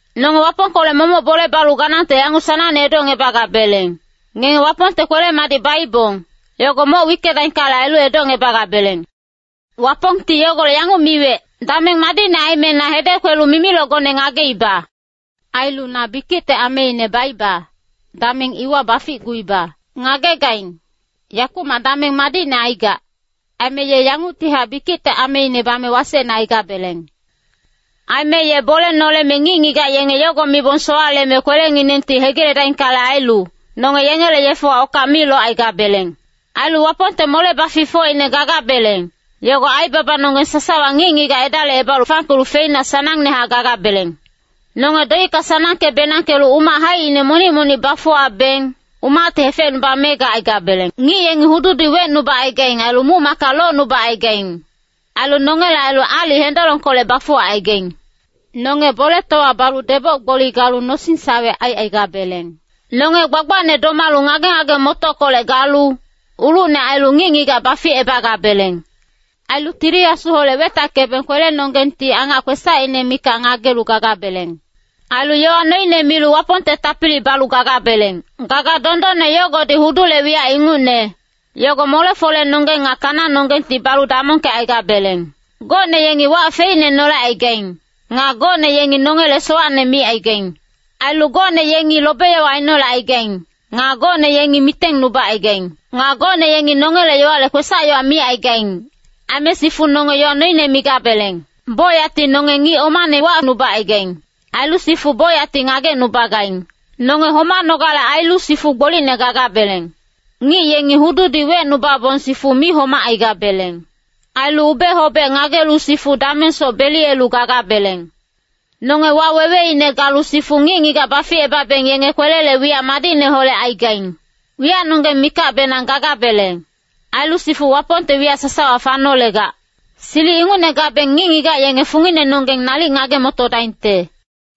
Nonge Wapongkolec momoc bole balu ganangte yanguc sanangne edocngebagabeleng, ngenge Wapongte kwele-madic baibong, yogo moc wickedaingkale ailu, edocngebagabeleng. Wapongti yogolec yanguc miwec, “Dameng madicne aime na hedec kwelu mimilocgone ngageiba. Ailu na bikicte ameine baiba, dameng iwa baficguiba.” Ngagegaing, yakumac dameng madicne aigac, aime ye yanguctihac bikicte ameine bame wasecne aigabeleng. Aime ye bole noleme ngic-ngigac yenge yogo mibong sowaleme kwelenginengti hegiledaingkale ailu, nonge yengele yefewa okac mi locaigabeleng. Ailu Wapongte mole-baficfocine gagabeleng, yogo aibabanonggeng sasawa ngic-ngigac edalicebalu fangkelu feina sanangnehac gagabeleng. Nonge doicka sanangke-benangkelu umac haicine monic-monic bafuwabeng, umacti hefecnubame gacaigabeleng. Ngic yengi hududi wecnubacaigaing, ailu muc-macka locnubacaigaing, ailu nongele ailu aalic hendolongkolec bafuwacaigaing. Nonge boletowa balu deboc-gboli galu nosing-sawe aicaigabeleng. Nonge gbagbacne domalu ngage-ngage-motockolec galu, ulucne ailu ngic-ngigac baficebagabeleng. Ailu Tili Asuholec wetackebeng kwelenonggengti angac kwesacine mikac ngagelu gagabeleng. Ailu yowa noine milu Wapongte tapili balu gagabeleng. Gaga dondonne yogodi hudule wiyac ingucne, yogo mole-folenonggeng nga kananonggengti balu damongkecaigabeleng. Gocne yengi wac feicne nolecaigaing. Nga gocne yengi nongele sowacne micaigaing. Ailu gocne yengi lobe-yowa ainolecaigaing. Nga gocne yengi mitengnubacaigaing. Nga gocne yengi nongele yowale kwesac-yowa micaigaing. Aime sifu nonge yowa noine migabeleng. Bocyacti nonge ngic omane wacnubacaigaing. Ailu sifu bocyacti ngagecnubagaing. Nonge homanogale ailu sifu gbolicne gagabeleng. Ngic yengi hududi wecnubabong sifu mi homacaigabeleng. Ailu ube-hobec ngagelu sifu damengsoc beliyelu gagabeleng. Nonge waweweine galu sifu ngic-ngigac baficebabeng yenge kwelele wiyac madicneholec aigaing. Wiyacnonggeng mikacbenang gagabeleng. Ailu sifu Wapongte wiyac sasawa fanolegac. Silic ingucne gabeng ngic-ngigac yenge funginenonggeng nalic ngage-motodaingte.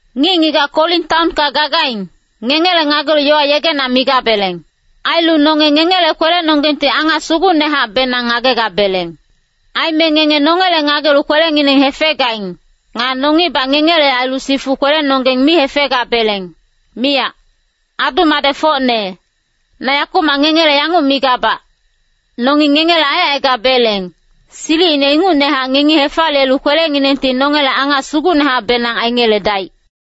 Ngic-ngigac Korin taonka gagaing, ngengele ngagelu yowa yegena migabeleng. Ailu nonge ngengele kwelenonggengti angac sugucnehacbenang ngagegabeleng. Aime ngenge nongele ngagelu kwelengineng hefegaing. Nga nongibac ngengele ailu sifu kwelenonggeng mi hefegabeleng, miyac. Adu-madecfocne, na yakumac ngengele yanguc migabac, nongi ngengele aicaigabeleng, silicine ingucnehac ngengi hefaliyelu kwelenginengti nongele angac sugucnehacbenang aingeledaic.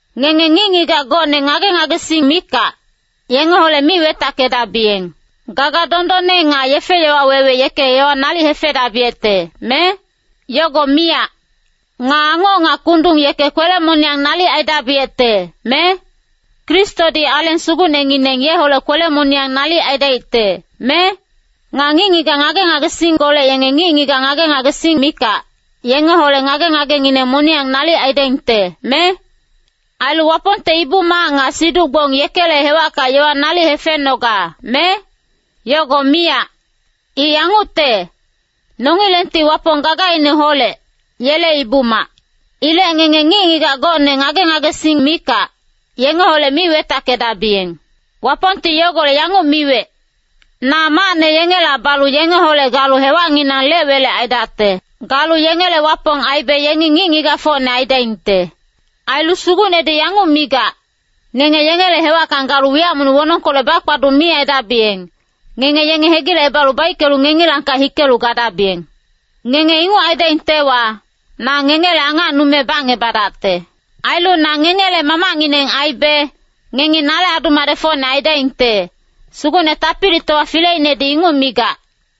Ngenge ngic-ngigac gocne ngage-ngagesing mikac, yengeholec mi wetackedabiyeng. Gaga dondonne nga yefe-yowa wewe yeke yowa nalic hefedabiyecte, me? Yogo miyac! Nga angoc nga kundung yeke kwele-moniyang nalic aidabiyecte, me? Kristodi Aleng Sugucnengineng yeholec kwele-moniyang nalic aidaicte, me? Nga ngic-ngigac ngage-ngagesingkolec yenge ngic-ngigac ngage-ngagesing mikac, yengeholec ngage-ngagengineng moniyang nalic aidaingte, me? Ailu Wapongte ibu-mac nga siduc-gbong yekele hewacka yowa nalic hefenoga, me? Yogo miyac! I yangucte, nongilengti Wapong gagaineholec, yele ibu-mac. Ilec ngenge ngic-ngigac gocne ngage-ngagesing mikac, yengeholec mi wetackedabiyeng. Wapongti yogolec yanguc miwec, “Na macne yengela balu yengeholec galu hewacnginang lec-welec aidacte. Galu yengele Wapong aibe yengi ngic-ngigacfocne aidaingte.” Ailu Sugucnedi yanguc migac, “Ngenge yengele hewacka galu wiyac monic wonongkolec bakpaduc mi aidabiyeng, ngenge yenge hegilecebalu baickelu ngengilangkac hikelu gadabiyeng. Ngenge inguc aidaingtewa, na ngengele angacnume bacngebadacte.” “Ailu na ngengele Mamacngineng aibe, ngengi nale adu-madecfocne aidaingte, Sugucne Tapilitowa Fileinedi inguc migac.”